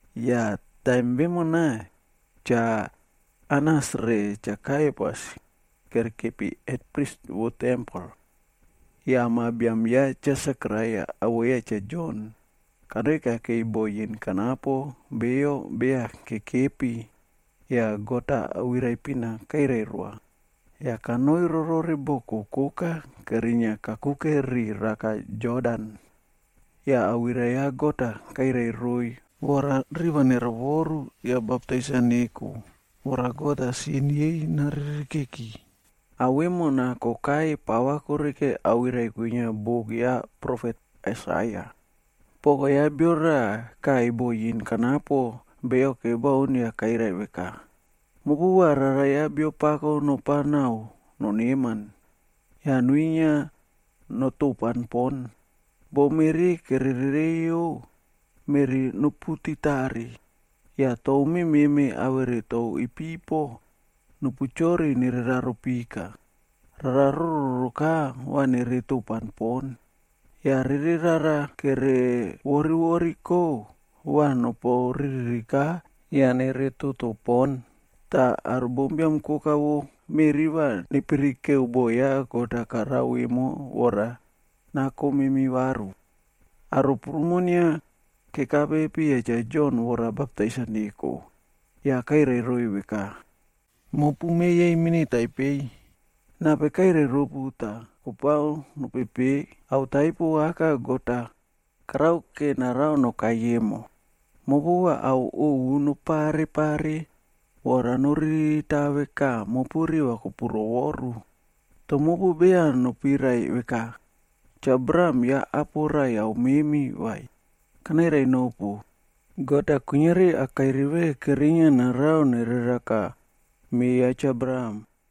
Yah taim vemona, Cha Anas re Cha Kaiapas kerekepi hetprisb vo tempel. Yah ma biam ya Cha Sekaraia awoꞌo ya Cha Jon, kanoi kakei bo yin kanapo beyo kebaun yah God-a awirai-a pina kairai roa. Yah kanoi rorore boko koka kerinia kakuke ri raka Jodan. Yah awirai ya God-a kairai roiy vora riꞌi va nerovoru yah baptais-a neko, vora God-a sin yei naririkeki. Ao vemona kokai pava koreke awirai kwinia buk ya profet Aisaia. “Poko ya bio raꞌa kaꞌai bo yin kanapo beyo kebaun yah kairai veka, ‘Mopu va rara ya Biapako nopao naꞌao noneman yah nuinia notopan pon. Bo meꞌri kere reireiyo, meꞌri noputitare yah tou mememe awere tou ipipo nopu chori nere raro pika. Rara rororoka va nere topan pon, yah rere rara kere vorivoriko va nopu riririka yah nere toto pon. Tah aro bombiam koka vo meꞌri va nepirikeo boꞌo God-a karao emo vora nako memi varu.’” c Aro prumo inia kekape piya Cha Jon vora baptais-a neko yah kairai roiy veka, “Mopu me yei mini taipei, nape kairai ropu tah kopao nopepe ao taipo aka God-a karake narao nokai emo? Mopu va ao ovu nopare pare vora noririta veka mopu riva kopuroworu. Toh mopu beya nopirai veka, ‘Cha Abraham ya apo raiyau memi vai.’ Kanairai nopu, God-a kuiniari akairi ve kerinia narao nereraka me ya Cha Abraham.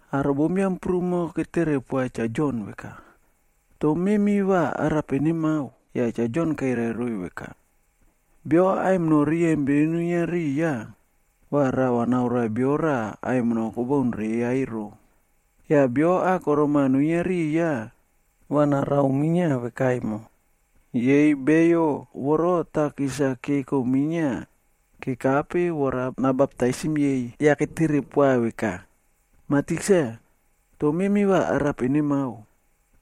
Aro bombiam prumo ketere poa Cha Jon veka, “Toh memi va arape nemao?” Yah Cha Jon kairai roiy veka, “Bio aimino riyempin nuinia riya, va rava naoroa bio raꞌa aimino kobaun reya ero. Yah bio akorom-a nuinia riya va narao minia veka emo.” Yei beyo voro takis-a keko minia kekape vora nabaptisim yei. Yah ketere poa veka, “Mah Tikse, toh memi va arape nemao?”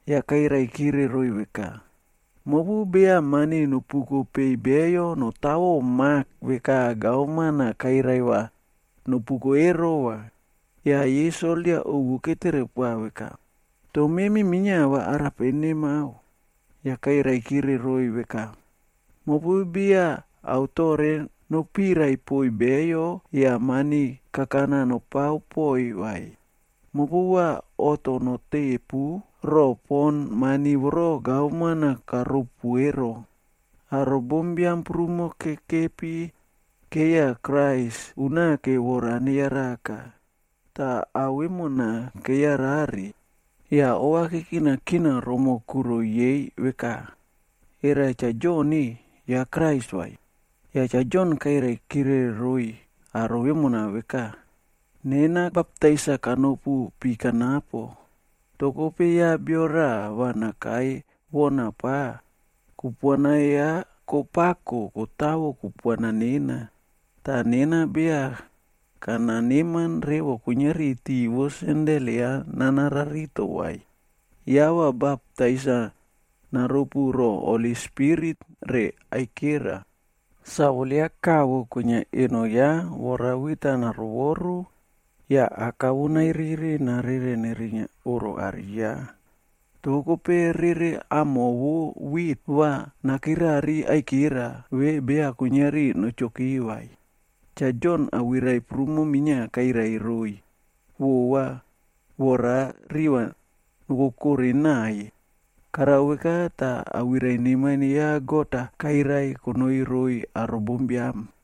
Yah kairai kire roiy veka, “Mopu beya mani nopuko peiy beyo notawo mak veka gavman-a kairai va nopuko ero va.” Yah yei soldia ovu ketere poa veka, “Toh memi minia va arape nemao?” Yah kairai kire roiy veka, “Mopu beya ao toꞌre nopirai poiy beyo yah mani kakana nopao poꞌoiy vai. Mopu va oꞌto notepu roꞌo pon mani voro gavman-a karopu ero.” Aro bombiam prumo kekepi keiya Krais unake vora neyaraka. Tah ao vemona keyarare, yah ova kekinakina romoꞌo kuro yei veka, “Era Cha Jon-e, ya Krais vai?” Cha Jon kairaikire roiy aro vemona veka, “Nena baptais-a kanopu pi kanapo, toh kope ya bio raꞌa va nakai wona pa, kupuana ya kopako kotawo kupuana nena. Tah nena beya kana neman revo kuiniari tiꞌi vo sendel ya nana rarito vai.d Ya va baptais-a naropu ro Holi Spirit re aikera. Sawol ya kavo kwinia eno ya vora wit-a naroworu yah aka vo nairiri narere nerinia oꞌro are ya. Toh kope rere amo vo wit va nakirari aikera ve beya kuiniari nochoki vai.” Cha Jon awirai prumo minia kairai roiy vova vora riva nokokoꞌo naꞌaiy. Karao veka tah Awirai Neman ya God-a kairai konoi roiy aro bombiam.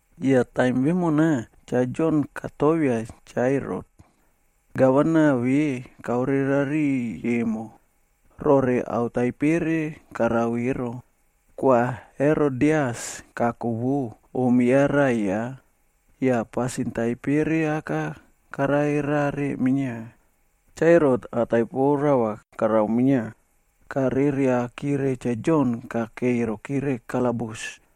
Yah taim vemona, Cha Jon katovia Cha Herot, gavana ve kaore rariꞌiy emo, rore ao taipere karao ero. Kwa Herodias kako vo, om ya raꞌai ya, yah pasin taipere aka karare rare minia. Cha Herot ao taipo rava karao minia, kareriakire Cha Jon kakei rokire kalabus.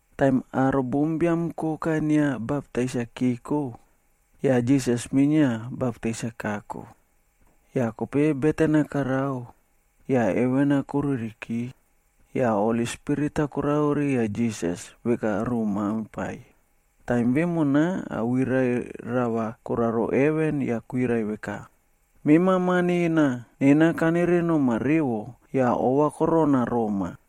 Taim aro bombiam koka inia baptais-a keko, yah Jisas-a minia baptais-a kako. Yah kope beten-a karao, yah heven-a koruriki. Yah Holi Spirit-a koraro riya Jisas veka ruꞌu maimpai. Taim vemona awirai rava koraro heven yah kwirai veka, “Mema Ma nena, nena kanere noma revo yah ova korona roma.”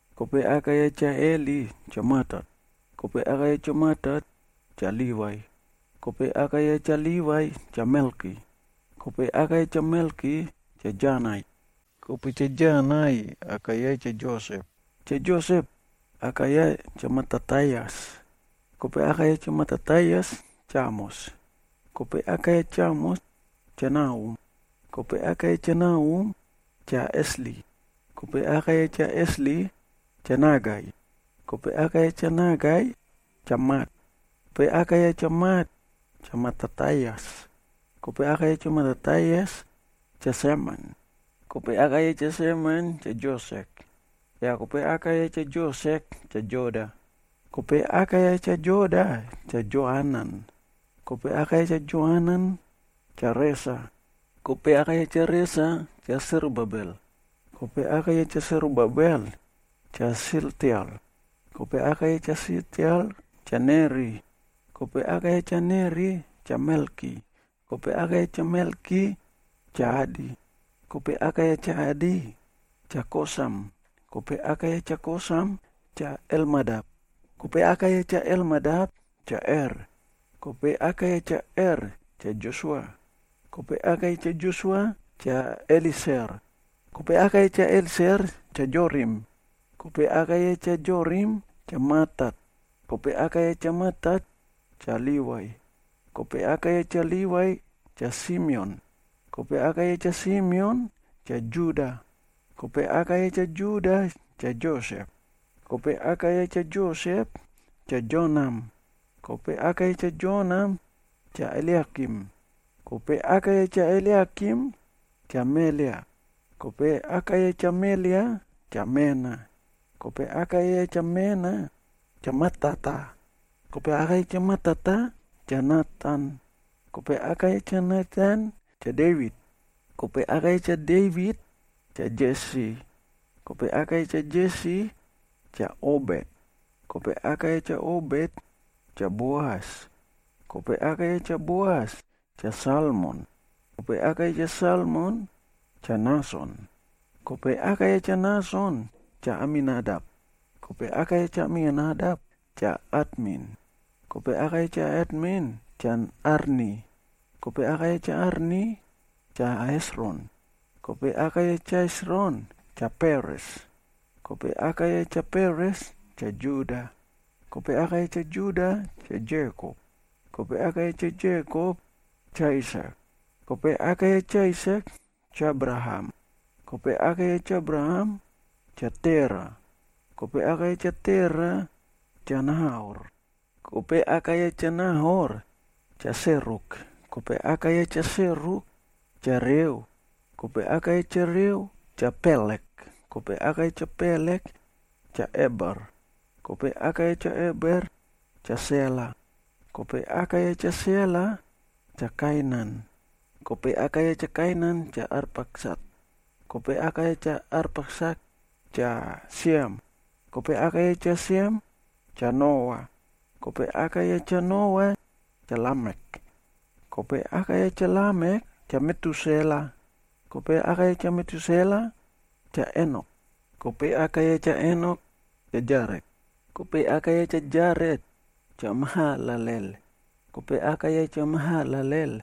Kope aka ya Cha Heli, Cha Matat, kope aka ya Cha Matat, Cha Livai, kope aka ya Cha Livai, Cha Melki, kope aka ya Cha Melki, Cha Janai. Kope Cha Janai aka ya, Cha Josep. Cha Josep aka ya Cha Matatias, kope aka ya Cha Matatias, Cha Amos, kope aka ya Cha Amos, Cha Nahum, kope aka ya Cha Nahum, Cha Esli, kope aka ya Cha Esli, Cha Nagai. Kope aka ya Cha Nagai, Cha Mat, kope aka ya Cha Mat, Cha Matatias, kope aka ya Cha Matatias, Cha Semen, kope aka ya Cha Semen, Cha Josek, yah kope aka ya Cha Josek, Cha Joda. Kope aka ya Cha Joda, Cha Joanan, kope aka ya Cha Joanan, Cha Resa, kope aka ya Cha Resa, Cha Serubabel, kope aka ya Cha Serubabel, Cha Sealtiel, kope aka ya Cha Sealtiel, Cha Neri. Kope aka ya Cha Neri, Cha Melki, kope aka ya Cha Melki, Cha Adi, kope aka ya Cha Adi, Cha Kosam, kope aka ya Cha Kosam, Cha Elmadam, kope aka ya Cha Elmadam, Cha Er. Kope aka ya Cha Er, Cha Josua, kope aka ya Cha Josua, Cha Elieser, kope aka ya Cha Elieser, Cha Jorim, kope aka ya Cha Jorim, Cha Matat, kope aka ya Cha Matat, Cha Livai. Kope aka ya Cha Livai, Cha Simeon, kope aka ya Cha Simeon, Cha Juda, kope aka ya Cha Juda, Cha Josep, kope aka ya Cha Josep, Cha Jonam, kope aka ya Cha Jonam, Cha Eliakim. Kope aka ya Cha Eliakim, Cha Melea, kope aka ya Cha Melea, Cha Mena, kope aka ya Cha Mena, Cha Matata, kope aka ya Cha Matata, Cha Natan, kope aka ya Cha Natan, Cha Devit. Kope aka ya Cha Devit, Cha Jesi, kope aka ya Cha Jesi, Cha Obet, kope aka ya Cha Obet, Cha Boas, kope aka ya Cha Boas, Cha Salmon, kope aka ya Cha Salmon, Cha Nason. Kope aka ya Cha Nason, Cha Aminadap, kope aka ya Cha Aminadap, Cha Atmin, kope aka ya Cha Atmin, Cha Arni, kope aka ya Cha Arni, Cha Hesron, kope aka ya Cha Hesron, Cha Peres, kope aka ya Cha Peres, Cha Juda. Kope aka ya Cha Juda, Cha Jekop, kope aka ya Cha Jekop, Cha Aisak, kope aka ya Cha Aisak, Cha Abraham, kope aka ya Cha Abraham, Cha Tera, kope aka ya Cha Tera, Cha Nahor. Kope aka ya Cha Nahor, Cha Seruk, kope aka ya Cha Seruk, Cha Reu, kope aka ya Cha Reu, Cha Pelek, kope aka ya Cha Pelek, Cha Eber, kope aka ya Cha Eber, Cha Sela. Kope aka ya Cha Sela, Cha Kainan, kope aka ya Cha Kainan, Cha Arpaksat. Kope aka ya Cha Arpaksat, Cha Siem, kope aka ya Cha Siem, Cha Noa. Kope aka ya Cha Noa, Cha Lamek. Kope aka ya Cha Lamek, Cha Metusela, kope aka ya Cha Metusela, Cha Enok, kope aka ya Cha Enok, Cha Jaret, kope aka ya Cha Jaret, Cha Mahalalel, kope aka ya Cha Mahalalel,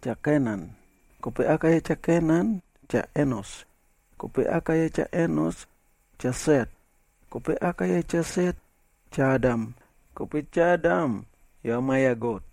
Cha Kenan. Kope aka ya Cha Kenan, Cha Enos, kope aka ya Cha Enos, Cha Set, kope aka ya Cha Set, Cha Adam. Kope Cha Adam, ya ma ya God.